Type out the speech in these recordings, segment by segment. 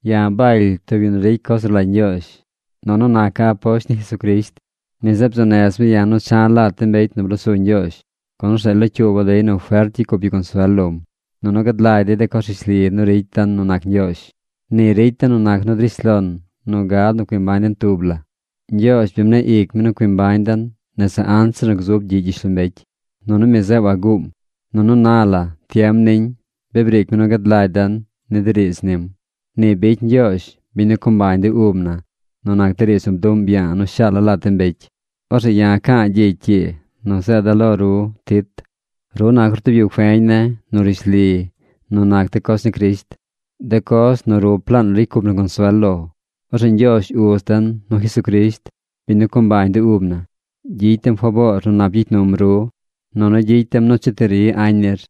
Ya̱ Baly tub yu nu ricy coz nu rlagy Ñgyoozh. Nunu naca̱ aposht ni Jesucrisht. Mi zeꞌ bzuu nez mi ya̱ nu cha̱ lat de mbecy nu blosu Ñgyoozh, gun orzeꞌ locyuuba̱ dey nu fert gyicy cup yu consuel lom, nunu gad lagy dey de coz rishli nu ricy den nu nac Ñgyoozh. Ni ricy den nu nac nu drish lon nu gad nu cui mbañ den tub la. Ñgyoozh bi mneꞌ ic mi nu cui mbañ den nese anzir nu gzub gyiꞌ gyishlombecy. Nunu mi zeꞌ waguum. Nunu na la, tiem niñ, bi briic mi nu gad lagy den ni de riidz nim. Ni bicy Ñgyoozh, biñ nu co mbañ de ub na, nu nac de riidz nu bduꞌm ya̱a̱ nu shaala̱ lat de mbecy. Orzeꞌ ya̱ ca̱a̱ gyicy ii nu zeeda̱ lo ru Tit. Ru nac ru tub yu feñ ne̱ nu rishli nu nac de coz ni Crisht, de coz nu rup laan ricy cup na consuel lo. Orzeꞌ Ñgyoozh Uz den nu Jesucrisht, biñ nu co mbañ de ub na, gyicy dem faboor nu nap gyicy num ru, nunu gyicy dem nu cheti ri añ nir.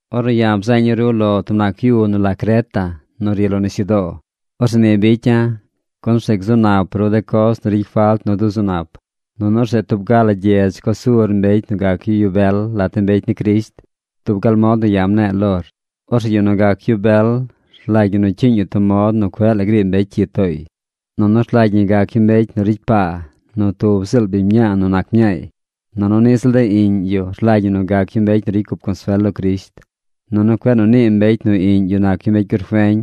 Ornu ya̱ bzeeña̱ ru lo tub nac yu nu la Creta nu ri lo nisyudoo, orzeꞌ ni bicya̱, gun orzeꞌ gzu nap ru de coz nu ricy falt nu duzu nap, nunu orzeꞌ tub ga la gyedz co sur mbecy nu gac yu yu bel lat de mbecy ni Crisht dub gal mod nu ya̱ mne̱e̱ lor. Orzeꞌ yu nu gac yu bel rlagy ñi nu cyiiñ yu tub mod nu cueꞌ la griib mbecy cyi tooy. Nunu rlagy ñi gac yu mbecy nu ricy paa nu tub ziꞌl biñ nu nac mñaay. Nunu niꞌ ziꞌl de iꞌñ yu rlagy ñi nu gac yu mbecy nu ricy cup consuel lo Crisht. Nunu cueꞌ nu nii mbecy nu iꞌñ yu nac yu mbecy gurfeñ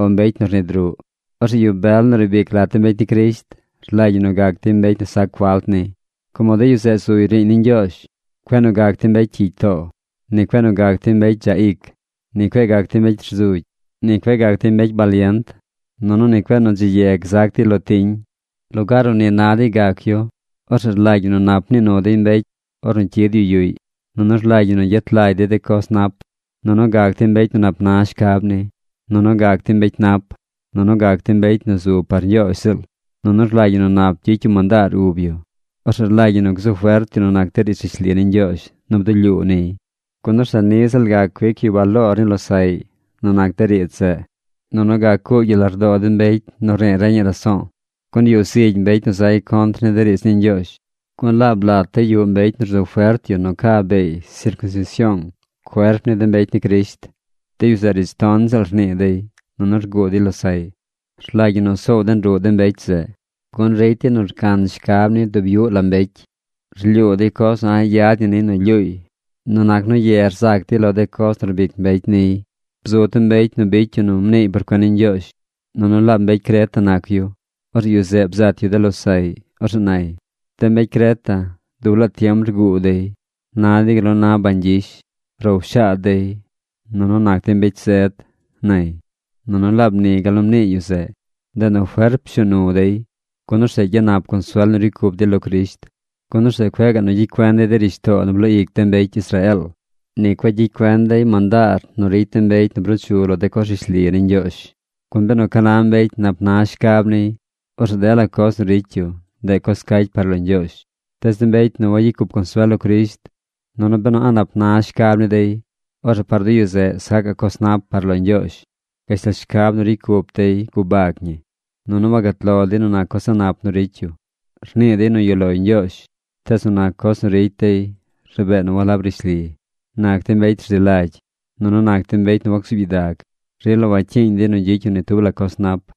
o mbecy nu rnid ruꞌ. Orzeꞌ yu bel nu riib ic lat de mbecy ni Crisht, rlagy ñi nu gac dey mbecy nu sac falt ni, como de yu zeꞌ zuy riiñ ni Ñgyoozh. Cueꞌ nu gac dey mbecy cyigy too. Ni cueꞌ nu gac dey mbecy dzaꞌ ic. Ni cueꞌ gac dey mbecy rzugy. Ni cueꞌ gac dey mbecy balient. Nunu ni cueꞌ nu dzi ye gzac dey lo tiñ. Lugaar nu ni na dey gac yu, orzeꞌ rlagy ñi nu nap nii nu dey mbecy ornu cyid yu yuꞌy. Nunu rlagy ñi nu gyet lagy dey de coz nap. Nunu gac dey mbecy nu nap na shcab ni. Nunu gac dey mbecy nap. Nunu gac dey mbecy nu zu par Ñgyoozh ziꞌl. Nunu rlagy ñi nu nap gyicy yu mandaar ub yu. Orzeꞌ rlagy ñi nu gzu fert yu nu nac de riidz rishli ni Ñgyoozh nu bdulyuu niy, gun orzeꞌ niꞌ ziꞌl gac cuic yu baloor ni losaꞌy nu nac de riidz zeꞌ, nunu gac cuugy yu lardoo de mbecy nu rnii reñaꞌ raso̱o̱. Gun yuꞌ zigy mbecy nu zay contr ni de riidz ni Ñgyoozh. Gun laab lat dey yuꞌ mbecy nu rzu fert yu nu ca beey sircunsision cuerp ni de mbecy ni Crisht. De yu zeꞌ riidz ton ziꞌl rnii dey, nunu rguu dey losaꞌy. Rlagy ñi nu soow den ruꞌ de mbecy zeꞌ, gun ricy dey nu rcan shcab ni dub yuꞌ la mbecy. Rlyuu dey coz nu a̱ꞌ yad ñi niy nu lyuuy nu nac nu ye rzac dey lo de coz nu rbic mbecy niy. Bzu tub mbecy nu bicy yu nu mniiy por cuen ni Ñgyoozh. Nunu laab mbecy Creta nac yu. Orzeꞌ yu zeꞌ bzat yu de losaꞌy. Orzeꞌ nay: “De mbecy Creta dub laa tiem rguu dey. Na dey gal nu na bañ gyish. Row shaad dey. Nunu nac dey mbecy zed”, nay. Nunu laab ni gal nu mnii yu zeꞌ. Ndeꞌ nu fert pshuu nu dey. Gun orzeꞌ gyanap consuel nu ricy cup dey lo Crisht. Gun orzeꞌ cueꞌ gaꞌ nu gyicy cuen dey de rishtoo nu bloo ic de mbecy Israeel. Ni cueꞌ gyicy cuen dey mandaar nu ricy de mbecy nu bruu chu lo de coz rishli ni Ñgyoozh. Gun benu ca na mbecy nap na shcab niy, orzeꞌ dela coz nu ricy yu, ndeꞌ coz cacy par lo Ñgyoozh. Tees de mbecy nu wayicy cup consuel lo Crisht nunu benu a̱ꞌ nap na shcab ni dey, orzeꞌ par de yu zeꞌ sacaꞌ coz nap par lo Ñgyoozh. Gashtal shcab nu ricy cup dey gubag ñi. Nunu wagat lo dey nu nac coz a̱ꞌ nap nu ricy yu. Rnii dey nu yuꞌ loy Ñgyoozh, tees nu nac coz nu ricy dey rabee nu walab rishli. Nac dey mbecy rzi lagy. Nunu nac dey mbecy nu wacsuub gyidag. Rila wacyiiñ dey nu gyicy yu ni tub la coz nap.